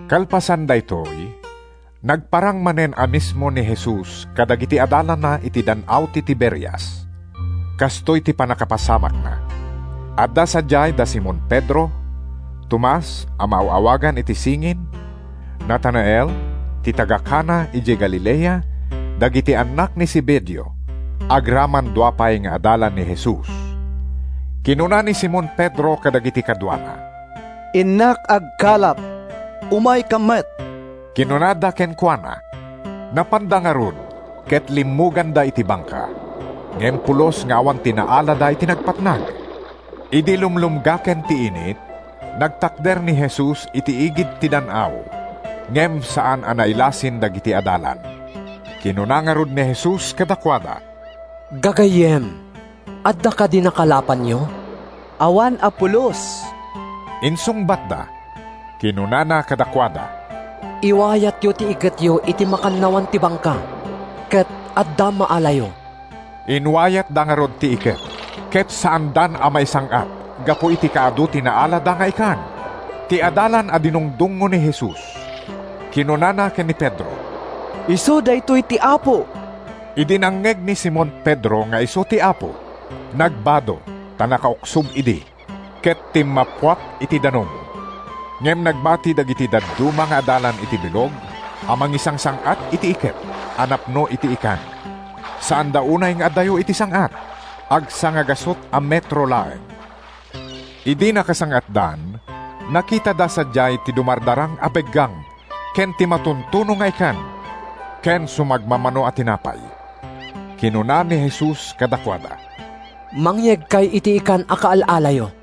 Kalpasan daytoy, nagparang manen a mismo ni Jesus kadagiti adalanna iti Dan-aw ti Tiberias. Kastoy ti pannakapasamakna: Adda sadiay da Simon Pedro, Tomas (a maaw-awagan iti “Singin”), Natanael (ti taga-Cana idiay Galilea), dagiti annak ni Zebedeo, agraman dua pay nga adalan ni Jesus. Kinuna ni Simon Pedro kadagiti kaduana, “Innak agkalap.” “Umaykam met,” kinunada kenkuana. Napanda ngarud ket limmuganda iti bangka. Ngem pulos nga awan ti naalada iti nagpatnag. Idi lumlumgaken ti init, nagtakder ni Jesus iti igid ti dan-aw, ngem saan a nailasin dagiti adalan. Kinuna ngarud ni Jesus kadakuada, “Gagayyem, adda kadi nakalapanyo?” “Awan a pulos,” insungbatda. Kinunana kadakuada, “Iwayatyo ti iketyo iti makannawan ti bangka, ket adda maalayo.” Inwayatda ngarud ti iket, ket saandan a maisang-at gapu iti kaadu ti naalada nga ikan. Ti adalan a dinungdungngo ni Jesus kinunana ken ni Pedro, “Isu daytoy ti Apo!” Idi nangngeg ni Simon Pedro nga isu ti Apo, nagbado (ta nakauksob idi) ket timmappuak iti danum. Ngem nagbati dagiti dadduma nga adalan iti bilog a mangisangsang-at iti iket a napno iti ikan. Saanda unay nga adayo iti sang-at. Agsangagasut a metro laeng. Idi nakasang-atdan, nakitada sadiay ti dumardarang a beggang ken ti matuntuno nga ikan ken sumagmamano a tinapay. Kinuna ni Jesus kadakuada, “Mangyegkay iti ikan a kaal-alayo.”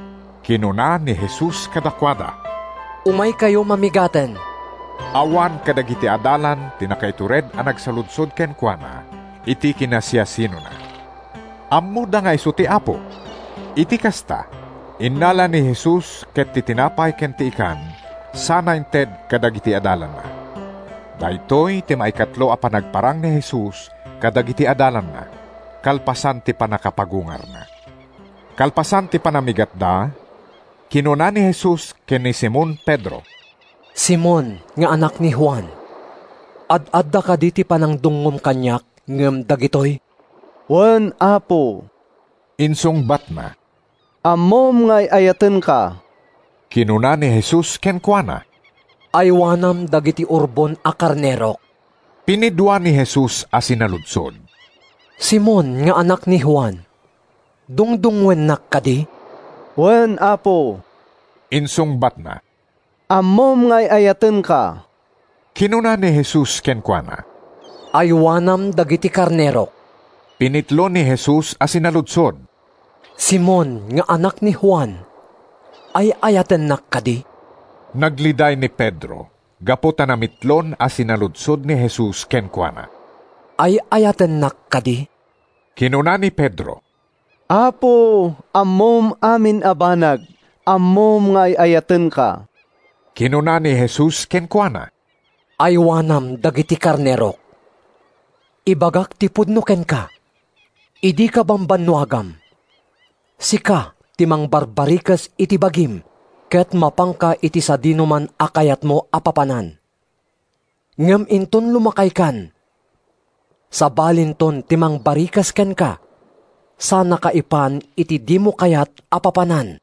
Kinuna ni Jesus kadakuada, “Umaykayo mamigaten.” Awan kadagiti adalan ti nakaitured a nagsaludsod kenkuana iti kinasiasinona. Ammoda nga isu ti Apo. Iti kasta, innala ni Jesus ket ti tinapay ken ti ikan sana inted kadagiti adalanna. Daytoy ti maikatlo a panagparang ni Jesus kadagiti adalanna kalpasan ti pannakapagungarna. Kalpasan ti panamigatda, kinuna ni Jesus ken ni Simon Pedro, “Simon nga anak ni Juan, ad-adda kadi ti panangdungngom kaniak ngem dagitoy?” “Wen, Apo,” insungbatna, “ammom nga ay-ayatenka.” Kinuna ni Jesus kenkuana, “Aywanam dagiti urbon a karnerok.” Pinidua ni Jesus a sinaludsod, “Simon nga anak ni Juan, dungdungngoennak kadi?” “Wen, Apo,” insungbatna, “ammom nga ay-ayatenka.” Kinuna ni Jesus kenkuana, “Aywanam dagiti karnerok.” Pinitlo ni Jesus a sinaludsod, “Simon nga anak ni Juan, ay-ayatennak kadi?” Nagliday ni Pedro gapu ta namitlon a sinaludsod ni Jesus kenkuana, “Ay-ayatennak kadi?” Kinuna ni Pedro, “Apo, ammom amin a banag. Ammom nga ay-ayatenka!” Kinuna ni Jesus kenkuana, “Aywanam dagiti karnerok. Ibagak ti pudno kenka: Idi kabambanuagam, sika ti mangbarbarikes iti bagim ket mapanka iti sadinoman a kayatmo a papanan. Ngem inton lumakaykan, sabalinto ti mangbarikes kenka sanaka ipan iti dimo kayat a papanan.”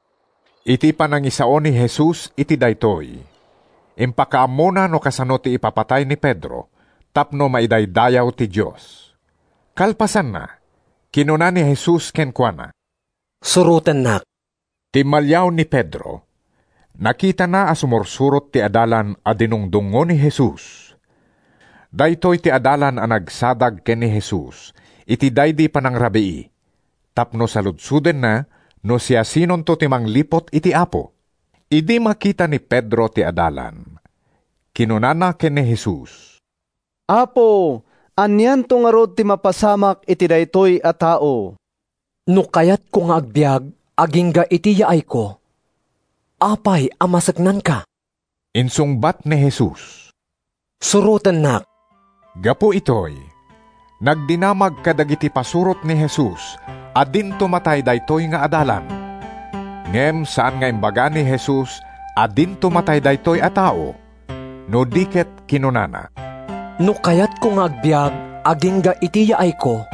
(Iti panangisao ni Jesus iti daytoy, impakaammona no kasano ti ipapatay ni Pedro tapno maidaydayaw ti Dios.) Kalpasanna, kinuna ni Jesus kenkuana, “Surotennak.” Timmaliaw ni Pedro. Nakitana a sumursurot ti adalan a dinungdungngo ni Jesus. Daytoy ti adalan a nagsadag ken ni Jesus iti daydi panangrabii tapno saludsodenna no siasinonto ti mangliput iti Apo. Idi makita ni Pedro ti adalan, kinunana ken ni Jesus, “Apo, anianto ngarud ti mapasamak iti daytoy a tao?” “No kayatko nga agbiag agingga iti yaayko, apay a maseknanka?” insungbat ni Jesus. “Surotennak!” Gapu itoy, nagdinamag kadagiti pasurot ni Jesus a dinto matay daytoy nga adalan. Ngem saan nga imbaga ni Jesus a dinto matay daytoy a tao, no di ket kinunana, “No kayatko nga agbiag agingga iti yaayko,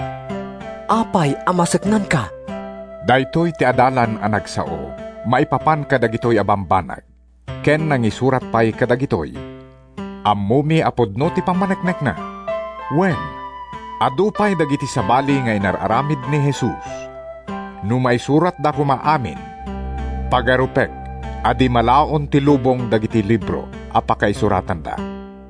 apay a maseknanka?” Daytoy ti adalan a nagsao maipapan kadagitoy a bambanag ken nangisurat pay kadagitoy. Ammomi a pudno ti pammaneknekna. Wen, adu pay dagiti sabali nga inar-aramid ni Jesus. No maisuratda koma amin, pagarupek a di malaon ti lubong dagiti libro a pakaisuratanda.